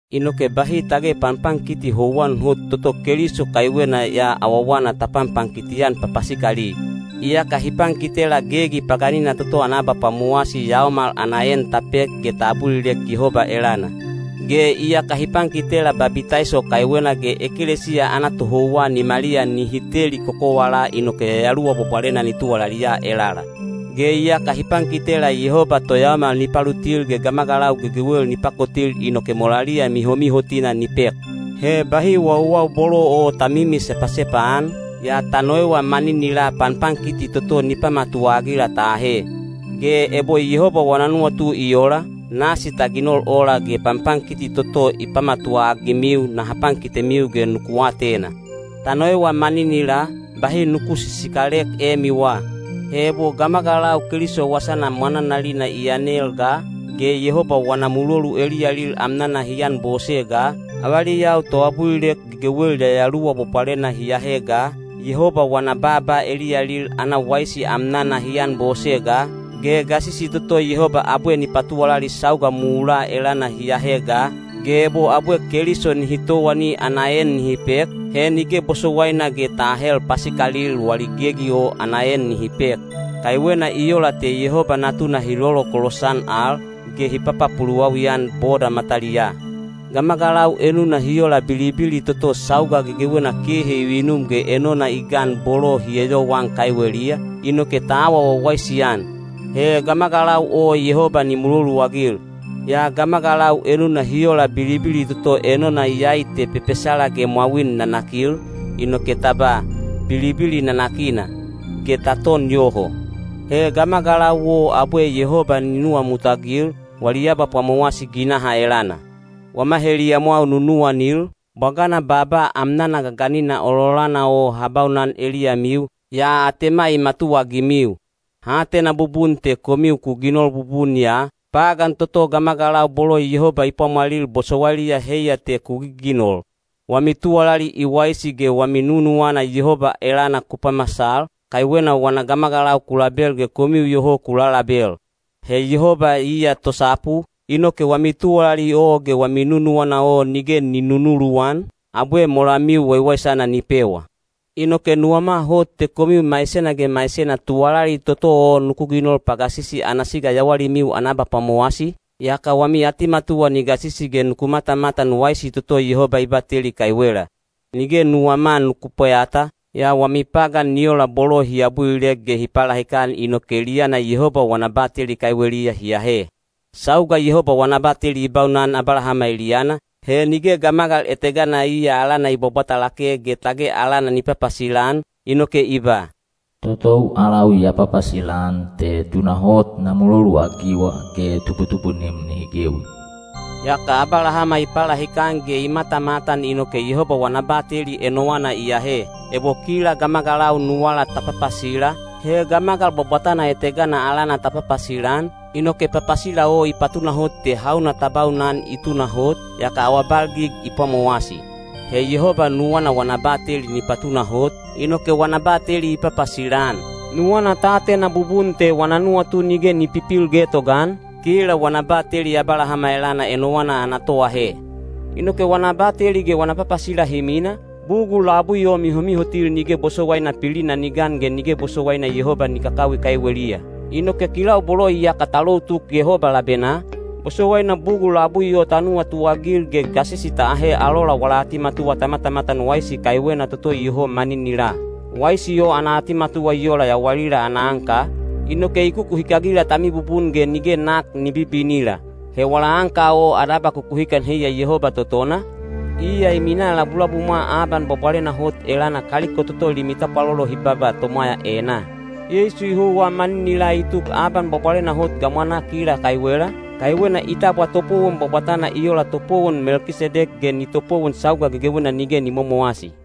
Inoke bahi tage panpankiti houwan hot toto Keliso kaiwena ya awawana ta panpankiti-an papasikali. Iyaka hi pankitela gegi paganina toto ana abapwamowasi yaomal ana en ta pek ge ta abulilek Yehoba elana. Ge iyaka hi pankitela babitaiso kaiwena ge ekelesiya ana tohouwa nimaliya nihi teli kokowalaa inoke Yayaluwa Bwabwalena ni tuwalaliya elala. Ge iyaka hi pankitela Yehoba toyaomal ni palutil ge gamagalau gegewel ni pakotil inoke molaliya mihomihotina ni pek. He bahi wauwau bolo o ta mimi sepasepa-an, yaa ta noewa maninilaa panpankiti toto ni pamatuwa-agila ta ahe. Ge ebo Yehoba wana nuwatu i ola, nasi ta ginol ola ge panpankiti toto ni pamatuwa-agimiu naha pankitemiu ge nuku atena. Ta noewa maninilaa, bahi nuku sisikalek emiwa. He ebo gamagalau Keliso wasana mwananalina i yanel ga, ge Yehoba wana mulolu eliyalil amnana hi anbose ga, avaliyau toabulilek gegewel Yayaluwa Bwabwalena hi ahe ga, Yehoba wana baaba eliyalil ana waisi amnana hi anbose ga, ge gasisi toto Yehoba abwe ni patuwalali sauga mulaa elana hi ahe ga, ge ebo abwe Keliso nihi towani ana en nihi pek, he nige bosowaina ge ta ahel pasikalil wali gegi o ana en nihi pek. Kaiwena i ola te Yehoba Natuna hi lolokolos-an al, ge hi papapuluwawi-an boda mataliyaa. Gamagalau enuna hi ola bilibili toto sauga gegewena kehe i vinum ge enona i gan bolo hi eyowaan kaiweliya, inoke ta awa wawaisi-an. He gamagalau o Yehoba ni muloluagil. Yaa gamagalau enuna hi ola bilibili toto enona iyai te pepesala ge mwawin nanakil, inoke ta ba, “Bilibili nanakina” ge ta ton yoho. He gamagalau o Yehoba abwe ni nuwamutagil, wali abapwamowasi ginaha elana. Wama heliyamwau nunuwanil, bwagana baaba amnana gaganina ololana o ha baunan eliyamiu, yaa atema i matuwaagimiu. Ha atena bubun te komiu ku ginol bubun ya, pagan toto gamagalau bolo Yehoba i pwamwalil bosowailiya heiya te ku giginol. Wami tuwalali i waisi ge wami nunuwana Yehoba elana ku pamasal, kaiwena wana gamagalau ku label ge komiu iyoho ku lalalabel. He Yehoba iya tosapu, inoke wami tuwalali o ge wami nunuwana o nige ni nunuluwan, abwe molamiu waiwaisana ni pewa. Inoke nuwama hot te komiu maisena ge maisena tuwalali toto o nuku ginol pagasisi ana siga yawalimiu ana abapwamowasi, yaka wami atimatuwa ni gasisi ge nuku matamatan waisi toto Yehoba i bateli kaiwela. Nige nuwama nuku pweyata, yaa wami pagan ni ola bolo hi abulilek ge hi palahikan inoke eliyana Yehoba wana bateli kaiweliya hi ahe. Sauga Yehoba wana bateli i baunan Abalahama eliyana, he nige gamagal etegana iya alana i bwabwata lake ge tage alana ni papasila-an, inoke i ba, “Totou alau ya papasila-an te tunahot na muloluagiwa ge tubutubunim nihi gewi.” Yaka Abalahama i palahikan ge i matamatan inoke Yehoba wana bateli enowana i ahe. Ebo kila gamagalau nuwala ta papasila, he gamagal bwabwatana etegana alana ta papasila-an, inoke papasila o i patunahot te hauna ta baunan i tunahot, yaka awabalgig i pwamowasi. He Yehoba nuwana wana bateli ni patunahot, inoke wana bateli i papasila-an. Nuwana ta atena bubun te wana nuwatu nige ni pipil getogaan, kila wana bateli Abalahama elana enowana ana toahe. Inoke wana bateli ge wana papasila hi mina, bugul labui o mihomihotil nige bosowaina pilina ni gan ge nige bosowaina Yehoba ni kakawi kaiweliya. Inoke kilau bolo iyaka ta lou tuk Yehoba labenaa, bosowaina bugul labui o ta nuwatuagil ge gasisi ta ahe alola wala atimatuwa ta matamatan waisi kaiwena toto iyoho maninilaa. Waisi o ana atimatuwa i ola yawalila ana anka, inoke i kukuhikagila ta mibubun ge nige nak ni bibinila. He wala anka o ana abakukuhikan heiya Yehoba totona, iya i minaa labulabumwa Aban Bwabwalena Hot elana kaliko toto limi tapwalolo hi baba tomwaya enaa. Yeisu i houwa maninilaa i tuk Aban Bwabwalena Hot gamwanaa kila kaiwela, kaiwena i tabwa topowon bwabwatana i ola topowon Melkisedek ge ni topowon sauga gegewena nige ni momowasi.